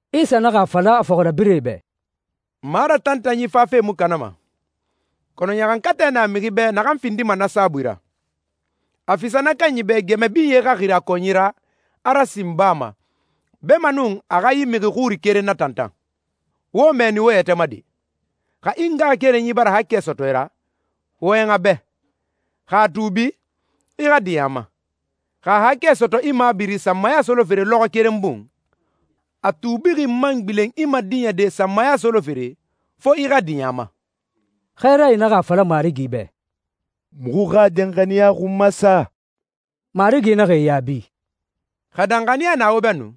Isa naxa a fala a fɔxirabirɛe bɛ, «Maratantanyi fafe mu kanama, kɔnɔ ɲaxankatɛ na mixi bɛ naxan findima na saabui ra. A fisa na kanyi bɛ gɛmɛ binye xa xiri a kɔnyi ra, a rasin baa ma, beemanun a xa yi mixi xuri keren natantan. Wo mɛɛni wo yɛtɛ ma de!» «Xa i ngaxakerenyi bara haakɛ sɔtɔ i ra, wɔyɛn a bɛ. Xa a tuubi, i xa diɲɛ a ma. Xa a haakɛ sɔtɔ i mabiri sanmaya solofere lɔxɔɛ keren bun, a tuubixi man gbilen i madiɲɛde sanmaya solofere, fo i xa diɲɛ a ma.» Xɛɛrae naxa a fala Marigi bɛ, «Muxu xa danxaniya xun masa!» Marigi naxa e yaabi, «Xa danxaniya na wo bɛ nu,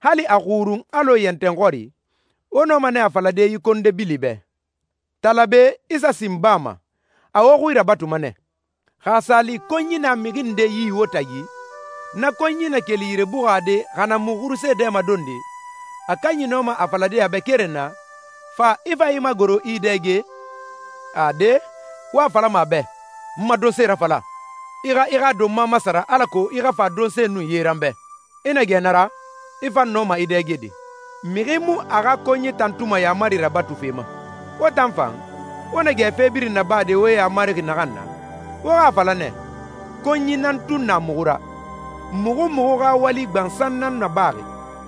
hali a xurun alɔ yɛntɛn xɔri, wo nɔma nɛ a falade yi konde bili bɛ, ‹Tala be, i sa sin baa ma,› a wo xui rabatuma nɛ.» «Xa a sa li konyi na mixi nde yi wo tagi, na konyi na keli yire buxade xa na mu xurusee dɛmadonde, a kanyi nɔma a falade a bɛ keren na, ‹Fa, i fa i magoro, i i dɛge›? Ade, wo a falama a bɛ, ‹N ma donse rafala. I xa i xa donma masara alako i xa fa donse nun ye ra n bɛ. I na gɛ na ra, i fan nɔma i dɛgede.› Mixi mu a xa konyi tantuma yaamari rabatufe ma. Wo tan fan, wo na gɛ fe birin nabade wo yamarixi naxan na, wo xa a fala nɛ, ‹Konyi nan tun na muxu ra. Muxu muxu xa wali gbansan nan nabaxi.›»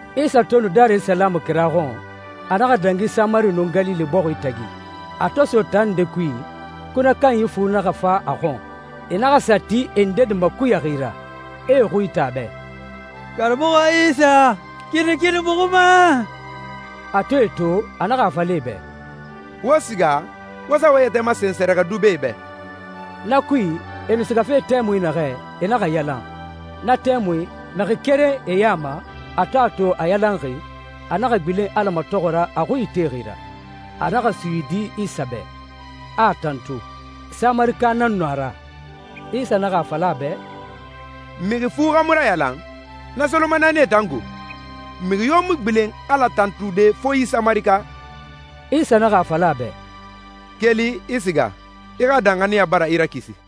Isa to nu Darisalamu kira xɔn, a naxa dangi Samari nun Galile bɔxi tagi. A to so taa nde kui, kunɛ kanyi fu naxa fa a xɔn. E naxa sa ti e ndedi makuyaxi a ra, e e xui ite a bɛ, «Karamɔxɔ Isa, kinikini muxu ma!» A to e to, a naxa a fala e bɛ, «Wo siga, wo sa wo yɛtɛ masen sɛrɛxɛdubɛe bɛ.» Na kui, e nu sigafe tɛmui naxɛ, e naxa yalan. Na tɛmui, mixi keren e ya ma, a to a to a yalanxi, a naxa gbilen Ala matɔxɔ ra a xui itexi ra. A naxa suyidi Isa bɛ, a a tantu. Samarika nan nu a ra. Isa naxa a fala a bɛ, «Mixi fu xa mu rayalan? Na solomanaanie tan go? Mixi yo mu gbilen Ala tantude fo yi Samarika?» Isa naxa a fala a bɛ, «Keli, i siga. I xa danxaniya bara i rakisi.»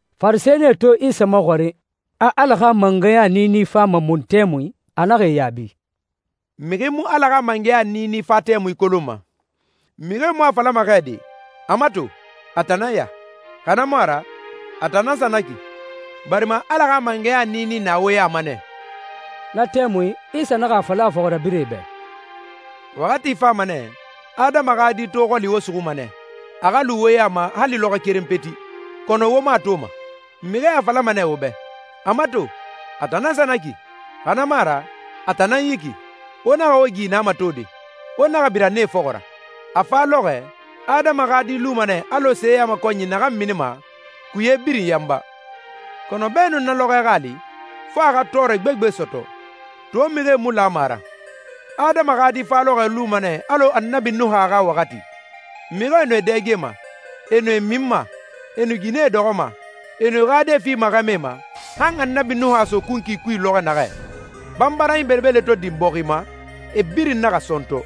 Farisɛnie to Isa maxɔrin, a Ala xa mangɛya niini fama mun tɛmui, a naxa e yaabi, «Mixi mu Ala xa mangɛya niini fa tɛmui kolonma. Mixie mu a falama xɛ de, ‹A mato, a tan nan ya,› xa na mu a ra, ‹A tan nan sa na ki›, barima Ala xa mangɛya niini na wo ya ma nɛ.» Na tɛmui, Isa naxa a fala a fɔxirabirɛe bɛ, «Waxati fama nɛ, Adama xa Di to xɔli wo suxuma nɛ, a xa lu wo ya ma hali lɔxɔ keren peti, kɔnɔ wo mu a toma. Mixie a falama nɛ wo bɛ, ‹A mato, a tan nan sa na ki,› xa na mu a ra, ‹A tan nan yi ki!› Wo naxa wo gi na matode, wo naxa bira nee fɔxɔ ra. A fa lɔxɔɛ, Adama xa Di luma nɛ alɔ seyamakɔnyi naxan minima, kuye birin yanba. Kɔnɔ beenun na lɔxɔɛ xa a li, fo a xa tɔɔrɛ gbegbe sɔtɔ. To mixie mu lama a ra. Adama xa Di fa lɔxɔɛ luma nɛ alɔ Annabi Nuha xa waxati. Mixie nu e dɛgema, e nu e minma, e nu ginɛe dɔxɔma, e nu e xa die fima xɛmɛe ma, han Annabi Nuha so kunkui kui lɔxɔ naxɛ. Banbaranyi belebele to din bɔxi ma, e birin naxa sɔntɔ.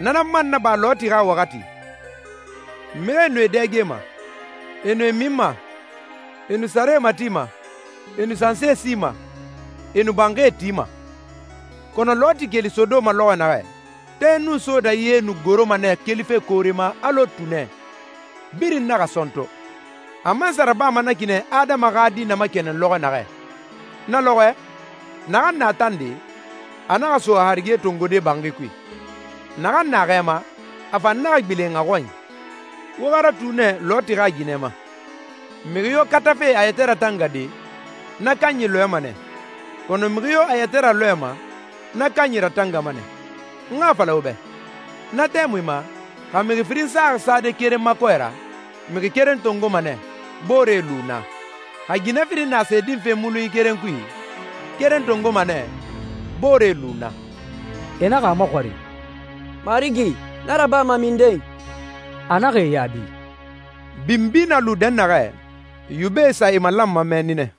Na nan man naba Loti xa waxati. Mixie nu e dɛgema, e nu e minma, e nu sare matima, e nu sansi sima, e nu banxie tima. Kɔnɔ Loti keli Sodoma lɔxɔ naxɛ, tɛ nun sooda ye nu goroma nɛ kelife koore ma alɔ tunɛ, birin naxa sɔntɔ. A man sa rabama na ki nɛ Adama xa Di na makɛnɛn lɔxɔ naxɛ.» «Na lɔxɔɛ, naxan na tande, a naxa so a harige tongode banxi kui. Naxan na xɛ ma, a fan naxa gbilen a xɔnyi. Wo xa ratu nɛ Loti xa ginɛ ma. Mixi yo katafe a yɛtɛ ratangade, na kanyi lɔɛma nɛ, kɔnɔ mixi yo a yɛtɛ ralɔɛma, na kanyi ratangama nɛ. N xa a fala wo bɛ, na tɛmui ma, xa mixi firin saxi sade keren ma kɔɛ ra, mixi keren tongoma nɛ, boore lu naa. Xa ginɛ firin na se dinfe mulunyi keren kui, keren tongoma nɛ, boore lu naa.» E naxa a maxɔrin, «Marigi, na rabama minden?» A naxa e yaabi, «Binbi na lu dɛnnaxɛ, yubɛe sa e malanma mɛnni nɛ.»